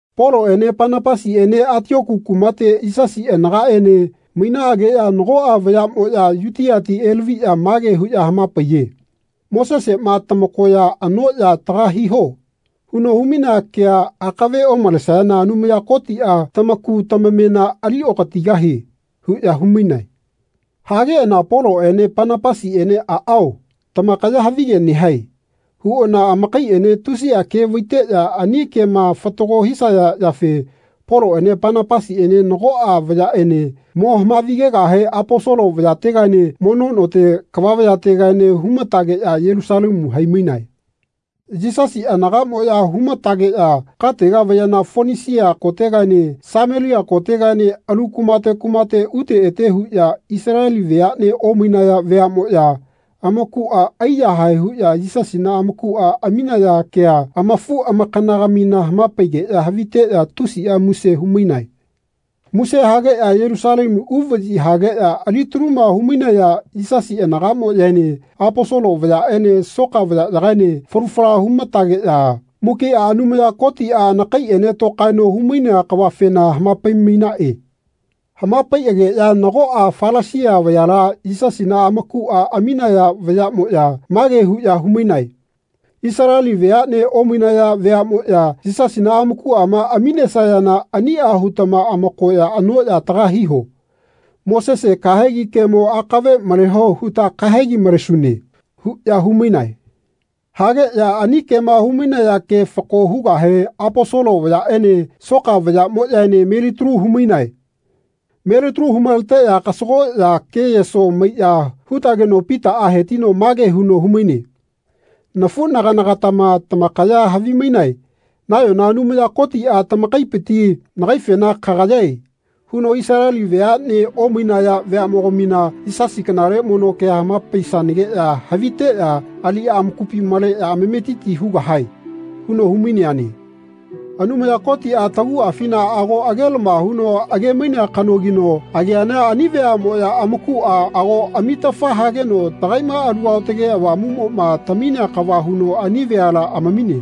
Poloꞌene Panapasiꞌene Atioku kumate Yisasi anagaꞌene mainaꞌageꞌya nagoꞌa vayaꞌmoꞌya Yutiati elaviꞌya mage huꞌya hamapaiye “Moseseꞌma ‘Tamakoya anoꞌya taga hiho.’ huno humainea kea akave omalesayana Anumaya Kotiꞌa tamaku tamamena aliokatigahie.” huꞌya humainae. Hageꞌana Poloꞌene Panapasiꞌene “Aꞌao, tamakaya havige nehae.” huꞌana amakaiꞌene tusiꞌa ke vaiteꞌya ani kema fatago hisaya yafe Poloꞌene Panapasiꞌene nagoꞌa vayaꞌene mo hamavigegahe Aposolo vayategaene mono note kava vayategaene humatageꞌya Yelusalemu haimainae. Yisasi anagaꞌmoꞌya humatageꞌya katega vayana Fonisia kotegaene Samelia kotegaene alu kumate kumate ute ete huꞌya Isaleli veaꞌne omainaya veaꞌmoꞌya amakuꞌa aiyahae huꞌya Yisasina amakuꞌa aminaya kea amafuꞌamakanagamina hamapaigeꞌya haviteꞌya tusiꞌa muse humainae. Muse hageꞌya Yelusalemu uvaꞌyi hageꞌya alitaluma humainaya Yisasi anagaꞌmoꞌyaene Aposolo vayaꞌene soka vayaꞌyagaene falu fala humatageꞌya mukiꞌa Anumaya Kotiꞌa anakaiꞌene tokaeno humainea kavafena hamapai-mainaꞌe. Hamapaiꞌageꞌya nagoꞌa Falasia vayala Yisasina amakuꞌa aminaya vayaꞌmoꞌya mage huꞌya humainae “Isaleli veaꞌne omainaya veaꞌmoꞌya Yisasina amakuꞌama aminesayana aniꞌa hutama amakoya anoꞌya taga hiho. Mosese kahegi kemo akave maleho huta kahegi malesune.” huꞌya humainae. Hageꞌya ani kema humainaya ke fako hugahe Aposolo vayaꞌene soka vayaꞌmoꞌyaene melitalu humainae. Melitalu humaleteꞌya kasagoꞌya ke-yeso maiꞌya hutageno Pitaꞌa hetino mage huno humaine nafuꞌnaganagatama tamakaya havimainae nayona Anumaya Kotiꞌa tamakaipiti nagaifena “Kagayae.” huno “Isaleli veaꞌne omainaya veaꞌmogamina Yisasi kanale mono kea hamapaisanageꞌya haviteꞌya aliꞌya amakupi maleꞌya amametiti hugahae.” huno humaineane. Anumaya Kotiꞌa taguꞌafina ago agelama huno agemainea kanogino ageana “Ani veaꞌmoꞌya amakuꞌa ago namitafa hageno tagaiꞌma Alu Aotage Avamuꞌmoꞌma taminea kava huno ani veala amamine.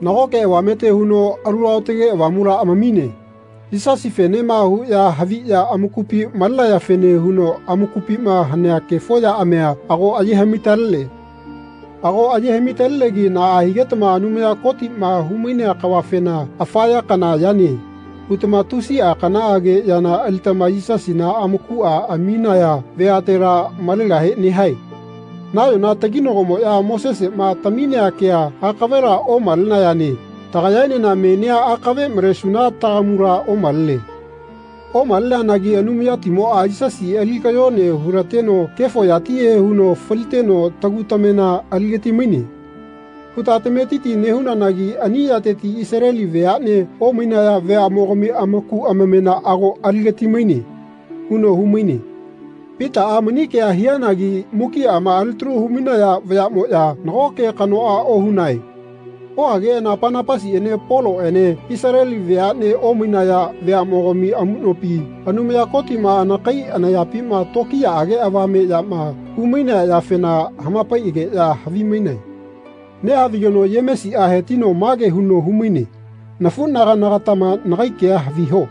Nagoꞌke avamete huno Alu Aotage Avamula amamine. Yisasifenema huꞌya haviꞌya amakupi malenayafene huno amakupima hanea kefo yaꞌamia ago aye haꞌmi-talene. Ago aye haꞌmi-talenegi naꞌa higetama Anumaya Kotiꞌma humainea kavafena ‘Afa ya kana yane.’ hutama tusiꞌa kanaꞌage yana alitama Yisasina amakuꞌa aminaya veatela malegahe nehae. Nayona taginagomoꞌya Moseseꞌma taminea kea akavela omalenayane tagayaenena menia akave malesuna tagamula omalene. Omaleneanagi ‘Anumayatimoꞌa Yisasi ali kayone hulateno kefo yatihe huno faliteno tagu tamena aligatimaine.’ huta tametiti nehunanagi ani yateti Isaleli veaꞌne omainaya veaꞌmogami amaku amamena ago aligatimaine.” huno humaine. Pitaꞌa mani kea hianagi mukiꞌama alitalu humainaya vayaꞌmoꞌya nago ke kanoꞌa ohunae. Ohageꞌana Panapasiꞌene Poloꞌene Isaleli veaꞌne omainaya veaꞌmogami amuꞌnopi Anumaya Kotiꞌma anakai anayapima tokiyaꞌage avame yama humainea yafena hamapaiꞌaꞌageꞌya havimainae. Nehavigeno Yemesiꞌa hetino mage huno humaine “Nafuꞌnaganagatama nagai kea haviho.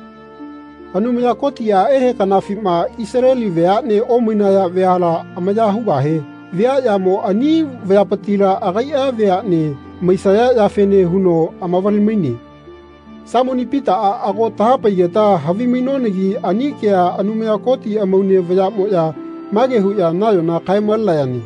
Anumaya Kotiꞌa ehe kanafima Isaleli veaꞌne omainaya veala amaya hugahe viaꞌyamo ani veapitila agaiꞌa veaꞌne maisaya yafene huno amavale-maine. Saimoni Pitaꞌa ago tahapaigeta havimainonagi ani kea Anumaya Koti amaune vayaꞌmoꞌya mage huꞌya nayona kae-malenayane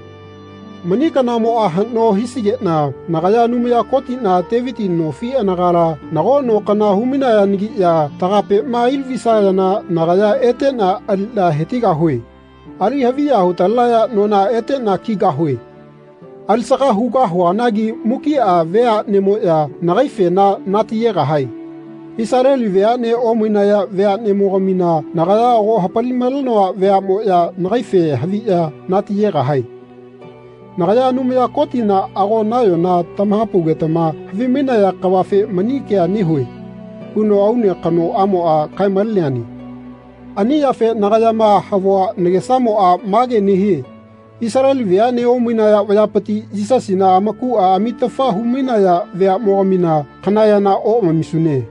‘Mani kanamoꞌa haꞌno hisigeꞌna nagaya Anumaya Kotiꞌna Teviti nofi anagala nago no kana hu-mainayanagiꞌya tagapema ailavisayana nagaya eteꞌna aliꞌna hetigahue. Ali-haviya hutalenaya nona eteꞌna kigahue. Alisaga hugahuanagi mukiꞌa veaꞌnemoꞌya nagaifena natiyegahae. Isaleli veaꞌne omainaya veaꞌnemogamina nagaya ago hapali-malenoa veaꞌmoꞌya nagaife haviꞌya nati-yegahae. Nagaya Anumaya Kotiꞌna ago nayona tamahapaugetama havimainaya kavafe mani kea nehue.’ huno aune kanoꞌamoꞌa kae-maleneane. Ani yafe nagayama havua nagesamoꞌa mage nehie Isaleli veaꞌne omainaya vayapiti Yisasina amakuꞌa amitafa humainaya veaꞌmogamina kana yana oꞌamamisune.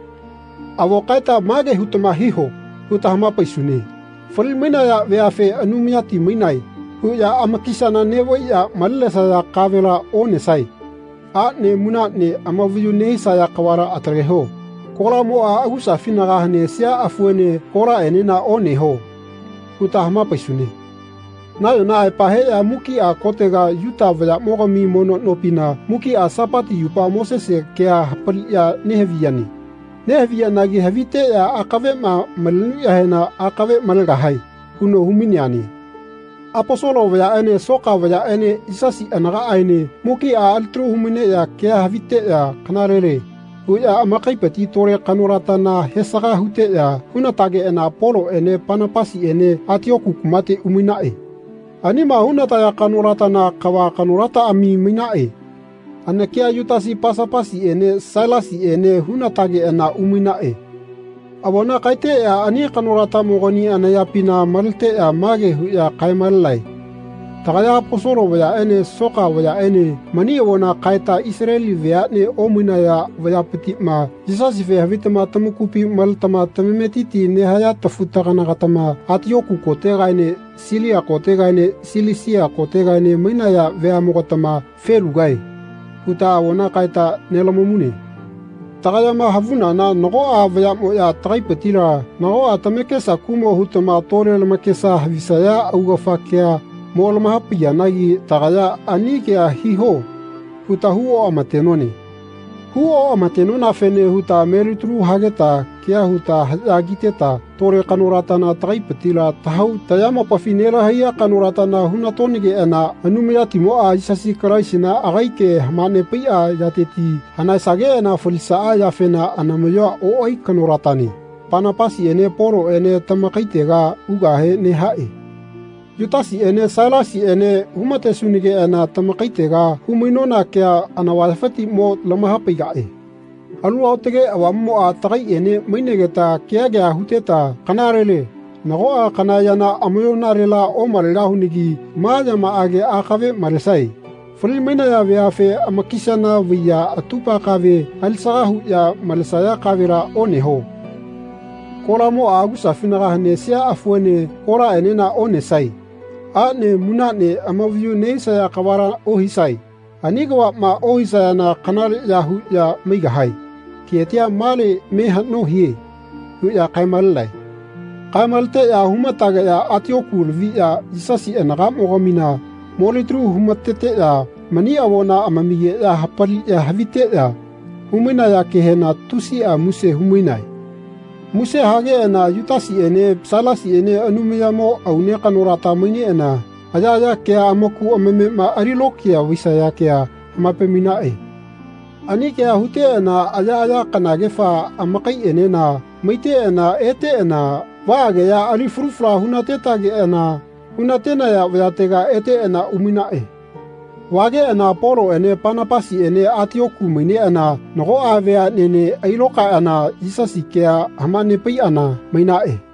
Avo kaeta ‘Mage hutama hiho.’ huta hamapaisune ‘Fali-mainaya veafe ‘Anumayati mainae.’ huꞌya amakisana neꞌvaiꞌya malenesaya kavela onesae. Aꞌne munaꞌne amavayu nehisaya kavala ataleho. Kolamoꞌa agusafinaga hanesia afuene kolaꞌenena oneho.’ huta hamapaisune. Nayona aepa heꞌya mukiꞌa kotega Yuta vayaꞌmogami mono nopina mukiꞌa Sapati yupa Mosese kea hapaliꞌya nehaviyane. Nehaviyanagi haviteꞌya akaveꞌma malenuꞌyahena akave malegahae.” huno humaineane. Aposolo vayaꞌene soka vayaꞌene Yisasi anagaꞌaene mukiꞌa alitalu humaineꞌya kea haviteꞌya “Kanalele.” huꞌya amakaipiti tole kanolatana hesaga huteꞌya hunatageꞌana Poloꞌene Panapasiꞌene Atioku kumate umainae. Anima hunataya kanolatana kava kanolataꞌami mainaꞌe. Anakia Yutasi Pasapasiꞌene Sailasiꞌene hunatageꞌana umainaꞌe. Avona kaeteꞌya ani kanolatamogani anayapina maleteꞌya mage huꞌya kae-malenae. Tagaya Aposolo vayaꞌene soka vayaꞌene mani avona kaeta Isaleli veaꞌne omainaya vayapitiꞌma Yisasife havitama tamakupi maletama tamametiti nehaya tafu-taganagatama Atioku kotegaene Silia kotegaene Silisia kotegaene mainaya veaꞌmogatama “Felugae.” huta avona kaeta nelamamune. Tagayama havunana nagoꞌa vayaꞌmoꞌya tagaipitila nagoꞌa tamakesa kuꞌmo hutama tole lamakesa havisaya augafa kea mo lamahapaiyanagi tagaya “Ani kea hiho.” huta hu-oꞌama-tenone. Hu-oꞌamatenonafene huta melitalu hageta kea huta haꞌya kiteta tole kanolatana tagaipitila tahau tayamopafi nelahaiya kanolata hunatonageꞌana Anumayatimoꞌa, Yisasi Kalaisina agai ke hamanepaiꞌa yateti hanaesageꞌana falisaꞌa yafena anamaꞌyoa oꞌai kanolatane, Panapasiꞌene Poloꞌene tamakaitega ugahe nehaꞌe. Yutasiꞌene Sailasiꞌene hunatesunageꞌana tamakaitega humainona kea anavayafiti mo lamahapaigaꞌe. Alu Aotage Avamuꞌmoꞌa tagaiꞌene mainegeta kea kea huteta “Kanalele nagoꞌa kana yana amayoꞌnalela omalegahunagi ma yamaꞌage akave malesae. Fali-mainaya veafe amakisana vaiꞌya atupa kave alisaga huꞌya malesaya kavela oneho. Kolamoꞌa agusafinaga hanesia afuene kolaꞌenena onesae. Aꞌne munaꞌne amavayu nehisaya kavala ohisae. Ani kavaꞌma ohisayana kanaleꞌya huꞌya maigahae. Ketia male me haꞌno hie.” huꞌya kae-malenae. Kae-maleteꞌya humatageꞌya Atioku laviꞌya Yisasi anagaꞌmogamina molitalu humateteꞌya mani avona amamigeꞌya hapaliꞌya haviteꞌya humainaya kehena tusiꞌa muse humainae. Muse hageꞌana Yutasiꞌene Sailasiꞌene Anumayamo aune kanolata maineꞌana ayaꞌaya kea amaku amamema alilokiya vaisaya kea hamapai-mainaꞌe. Ani kea huteꞌana ayaꞌaya kanagefa amakaiꞌenena maiteꞌana eteꞌana vaꞌageꞌya ali falu fala hunatetageꞌana hunatenaya vayatega eteꞌana umainaꞌe. Vageꞌana Poloꞌene Panapasiꞌene Atioku maineꞌana nagoꞌa veaꞌnene ailokaeꞌana Yisasi kea hamanepaiꞌana mainaꞌe.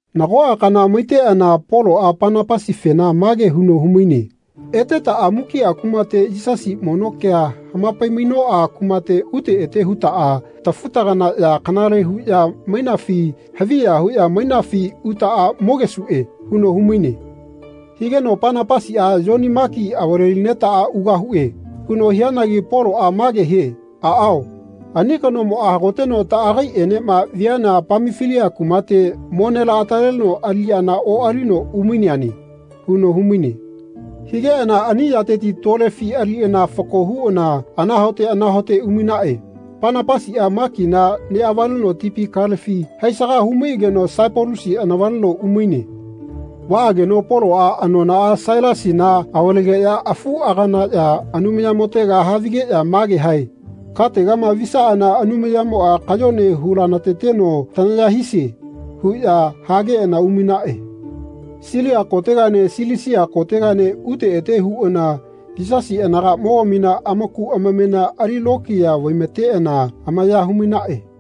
Nagoꞌa kana maiteꞌana Poloꞌa Panapasifena mage huno humaine “Etetaꞌa mukiꞌa kumate Yisasi mono ke hamapai-mainoꞌa kumate ute ete hutaꞌa tafu-taganaꞌya kanaleꞌya huꞌya mainafi haviya huꞌya mainafi utaꞌa mogesuꞌe.” huno humaine. Higeno Panapasiꞌa “Yoni Maki avale-linetaꞌa ugahuꞌe.” huno hianagi Poloꞌa mage hie “Aꞌao, ani kanomoꞌa hagoteno taꞌagaiꞌenema viana Pamafilia kumate mo nelaꞌataleno aliꞌyana oꞌalino umaineane.” huno humaine. Higeꞌana ani yateti tolefi aliꞌana fako huꞌana anahaote anahaote umainaꞌe. Panapasiꞌa Makina neꞌavaleno tipi kalefi haisaga humaiꞌageno Saipalusi anavaleno umaine. Vaꞌageno Poloꞌa anonaꞌa Sailasina avalegeꞌya afuꞌaganaꞌya Anumayamotega havigeꞌya mage hae “Kategama visaꞌana Anumayamoꞌa kayone hulanateteno tanaya hisie.” huꞌya hageꞌana umainaꞌe. Silia kotegaene Silisia kotegaene ute ete huꞌana Yisasi anagaꞌmogamina amaku amamena ali lokiya vaimateꞌana amaya humainaꞌe.